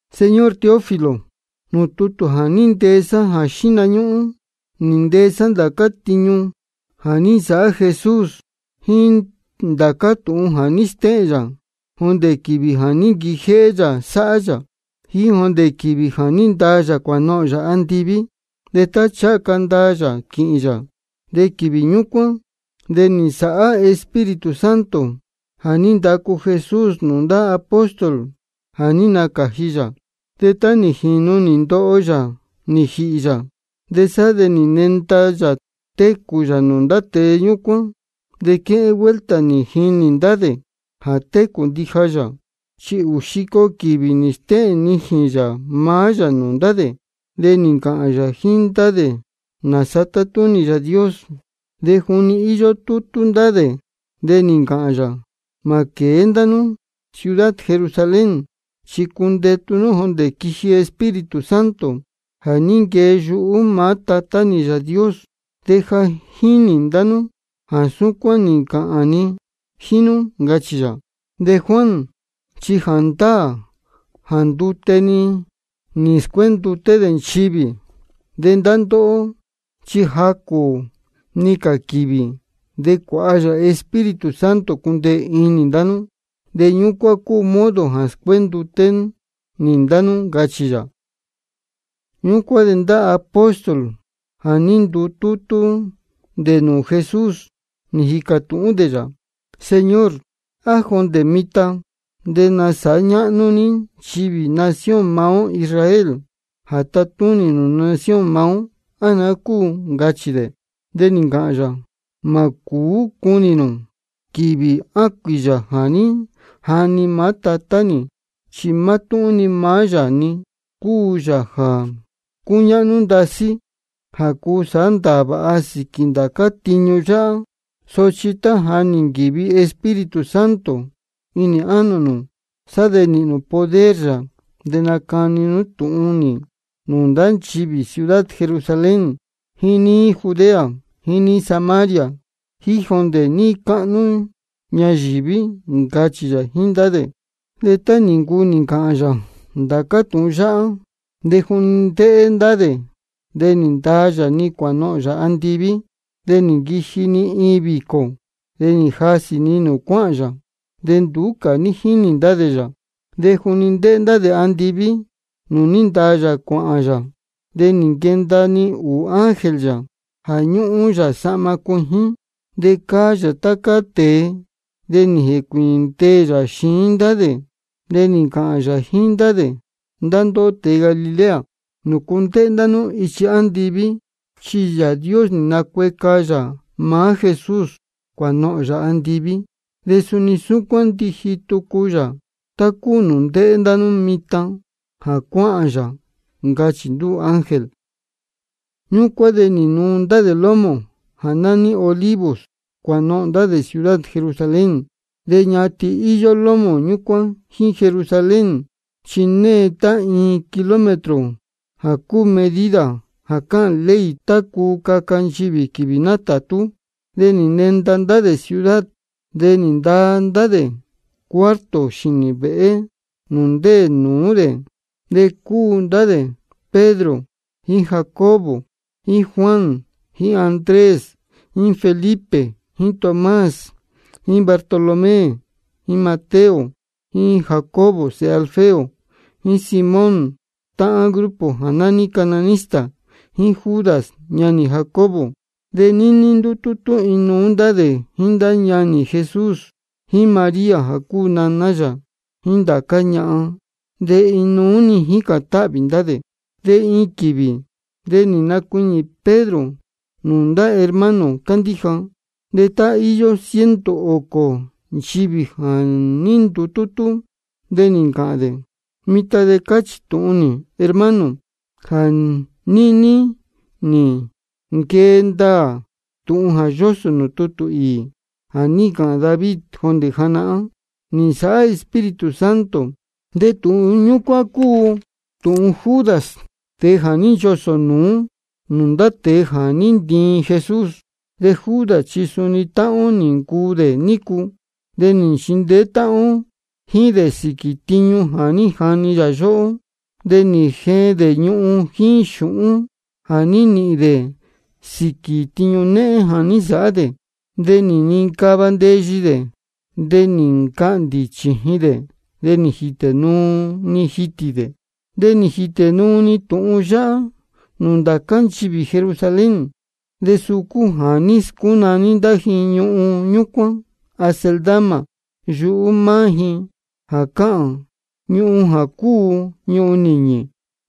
Señor Teófilo, nūū tútū jā ní ntee sá jā xíhna ñúhún, nī ntee sá ndācá tiñu jā ní nsāhá Jesús jíín ndācá tūhun jā ní stéhēn yā jondē quīvī jā ní nquijéhé yā sáhá yā jíín jondē quīvī jā ní ndaa yā cuānohōn yā andiví. De tá ncháha ca ndaa yā quīhīn yā de quīvī ñúcuán de nī nsāhá Espíritu Santo jā ní ndacu Jesús nūū ndá apóstol jā ní nacāji yā. De tá nī jīnu nī ndoho yā nī jīhī yā, de sá de nī nenda yā técū yā nūū ndá tēe ñúcuán, de quéhén vuelta nī jinī ndá dē jā técū ndija yā. Chi ūū xico quīvī nī stéhēn nijīn yā maá yā nūū ndá dē, de nī ncāhān yā jíín ndá dē nāsa tátúnī Yāā Dios. De juni íyó tútú ndá dē de nī ncāhān yā: Mā quēé ndá nú ciudad Jerusalén, chi cundetu nú jondē quiji Espíritu Santo jā ní nquee yuhú maá Tatá nī Yāā Dios. De ja nī jini ndá nú jā súcuán nī ncāhān ni jíín nú, ncachī yā. De Juan chi jāndáā jā ndute-ni nī scuénduté dē nchivī. De ndá ndóhó chi jacū-ni cā quīvī de cuāha nī Espíritu Santo cundeē inī ndá nú, de ñúcuán cúu modo jā scuénduté nī ndá nú, ncachī yā. Ñúcuán de ndá apóstol jā ní ndutútú dē nūū Jesús, nī jīcā tūhún dē yā: Señor, ¿á jondē mitan de nasāhá ñáhnú ní nchivī nación maá ó Israel jā tatúnī nūū nación maá ó, á naá cúu? ncachī dē. De nī ncāhān yā: Mā cūú cunī nū quīvī á cuīyā jā ní jani maá Tatá nī, chi mátúhún maá yā-ni cúu Yāā jā cúñáhnú ndasí jā cuu sāhá ndāā vāha sīquī ndācá tiñu yáhá. Sochi tá ja nī nquīvi Espíritu Santo inī ánō nū, sá de nīhīn nū poder yā, de nacani nú tūhun nī nūū ndá nchivī ciudad Jerusalén jíín níí Judea jíín níí Samaria jíín jondē níí cáhnú ñayīví, ncachī yā jíín ndá dē. De tá nī ncuu nī ncāhān yā ndācá tūhun yáhá, de juni ndéhé ndá dē de nī ndaa yā-ni cuānohōn yā andiví. De nī nquiji-ni iin vīcō, de nī jasī-ni nūū cuáhān yā, de nduú cā ní jínī ndá dē yā. De juni ndéhé ndá dē andiví nūū ní ndaa yā cuāhān yā, de nī nquenda-ni ūū ángel yā jā ñúhún yā sahma cuijín de cáá yā tá cáá tēe. De nī jēcuīñī ndeē yā xiín ndá dē. De nī ncāhān yā jíín ndá dē: Ndá ndóhó tēe Galilea, ¿nūcu ndéhé ndá nú ichi andiví? Chi Yāā Dios nī nacueca yā maá Jesús cuānohōn yā andiví, de suni súcuán ndiji tucu yā tá cúu nūū ndéhé ndá nú mitan jā cuáhān yā, ncachī ndúū ángel. Ñúcuán de nī nuu ndá dē lómō jā nání Olivos cuānohōn ndá dē ciudad Jerusalén. De ñatin-ni íyó lómō ñúcuán jíín Jerusalén, chi née tá iin kilómetro, jā cúu medida jā cáhān ley tá cuu caca nchivī quīvī nátātú. De nī nenda ndá dē ciudad, de nī ndaa ndá dē cuarto xīnī vēhé nūū ndéē nūú dē. De cúu ndá dē Pedro jíín Jacobo jíín Juan jíín Andrés jíín Felipe jíín Tomás jíín Bartolomé jíín Mateo jíín Jacobo sēhe Alfeo, jíín Simón táhán grupo jā nání cananista, jíín Judas ñanī Jacobo. De níní ndútútú inuú ndá dē jíín ndá ñanī Jesús, jíín María jā cúu naná yā, jíín ndá cā ñahan, de inuú-ni jícān táhvī ndá dē. De iin quīvī de nī nacuiñī Pedro nūū ndá hermano cándíja. De íyó tá ciento ōcō nchivī jā ní ndutútú. De nī ncāhān dē: Mitan de cáchī tūhun nī, hermano, jā níní nī nquee ndaā tūhun jā yósō nūū tutū īī jā ní ncāhān David jondē janahán nī nsāhá Espíritu Santo. De tūhun ñúcuán cúu tūhun Judas, tēe jā ní nchosō nūú nūū ndá tēe jā ní ntiin Jesús. De Judas chi suni táhán ó nī ncuu dē nícu, de nī nchindeé táhán ó jíín dē sīquī tiñu jā ní jani yā yóhó. De nī jeen dē ñuhun jíín xūhún jā ní nīhīn dē sīquī tiñu néhén jā ní nsāhá dē. De nī nincava ndeyi dē, de nī ncahndī-ni chījin dē, de nī jītē-ni jitī dē. De nī jītē nuu-ni tūhun yáhá nūū ndācá nchivī Jerusalén. De jā suu cúu jā ní scúnaní ndá ji ñuhun ñúcuán Acéldama yuhú maá ji, jā cáhān: Ñuhun jā cúu Ñuhun Nīñī.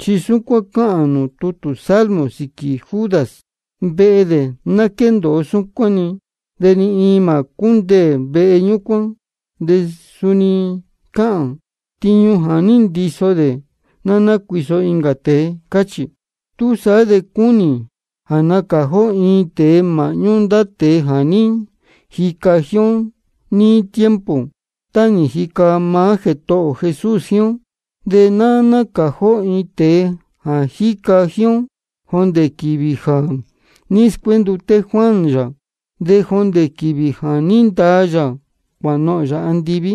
Chi súcuán cáhān nūū tutū Salmo sīquī Judas: Vehe dē, ná quéndōo súcuán-ni, de ni iin mā cúndeē cā vehe ñúcuán. De suni cáhān: Tiñu jā ní ndiso dē ná nácuiso incā tēe. Cáchī. Túsaá de cúnī jā nacāji ó iin tēe māhñú ndá tēe jā ní jica ó jíín níí tiempo tá nī jica maá Jētohō ō Jesús jíín ó. De ná nácāji ó iin tēe jā ní jica jíín ó jondē quīvī jā ní scuénduté Juan yā, de jondē quīvī jā ní ndaa yā cuānohōn yā andiví.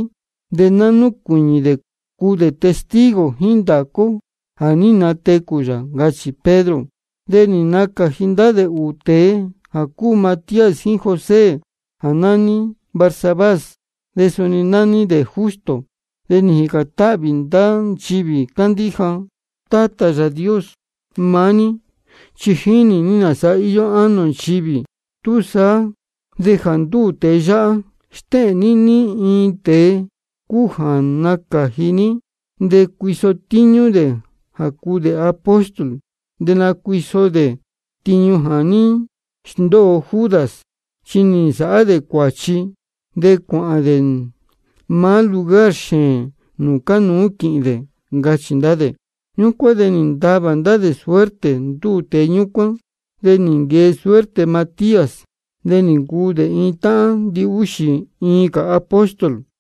De ná núcuīñī dē cuu dē testigo jíín ndācá ó jā ní natecū yā, ncachī Pedro. De nī nacāji ndá dē ūū tēe jā cúu Matías jíín José jā nání Barsabás, de suni nání dē Justo. De nī jīcān táhvī ndá nchivī cándíja: Tátā Yāā Dios, maá ní chi jínī ní nāsa íyó ánō ndá nchivī. Túsaá de jā ndúū tēe yáhá, stéhēn ní ní tēe cúu jā ní nacāji ní. De cuiso tíñú dē jā cuu dē apóstol. De nacuiso dē tiñu jā ní sndóo Judas, chi nī nsāhá dē cuāchi, de cuāhān dē maá lugar xēēn nūū cánuú quīhīn dē, ncachī ndá dē. Ñúcuán de nī ntavā ndá dē suerte ndúū tēe ñúcuán. De nī nquee suerte Matías, de nī ncuu dē iin táhán ndihúxī iin cā apóstol.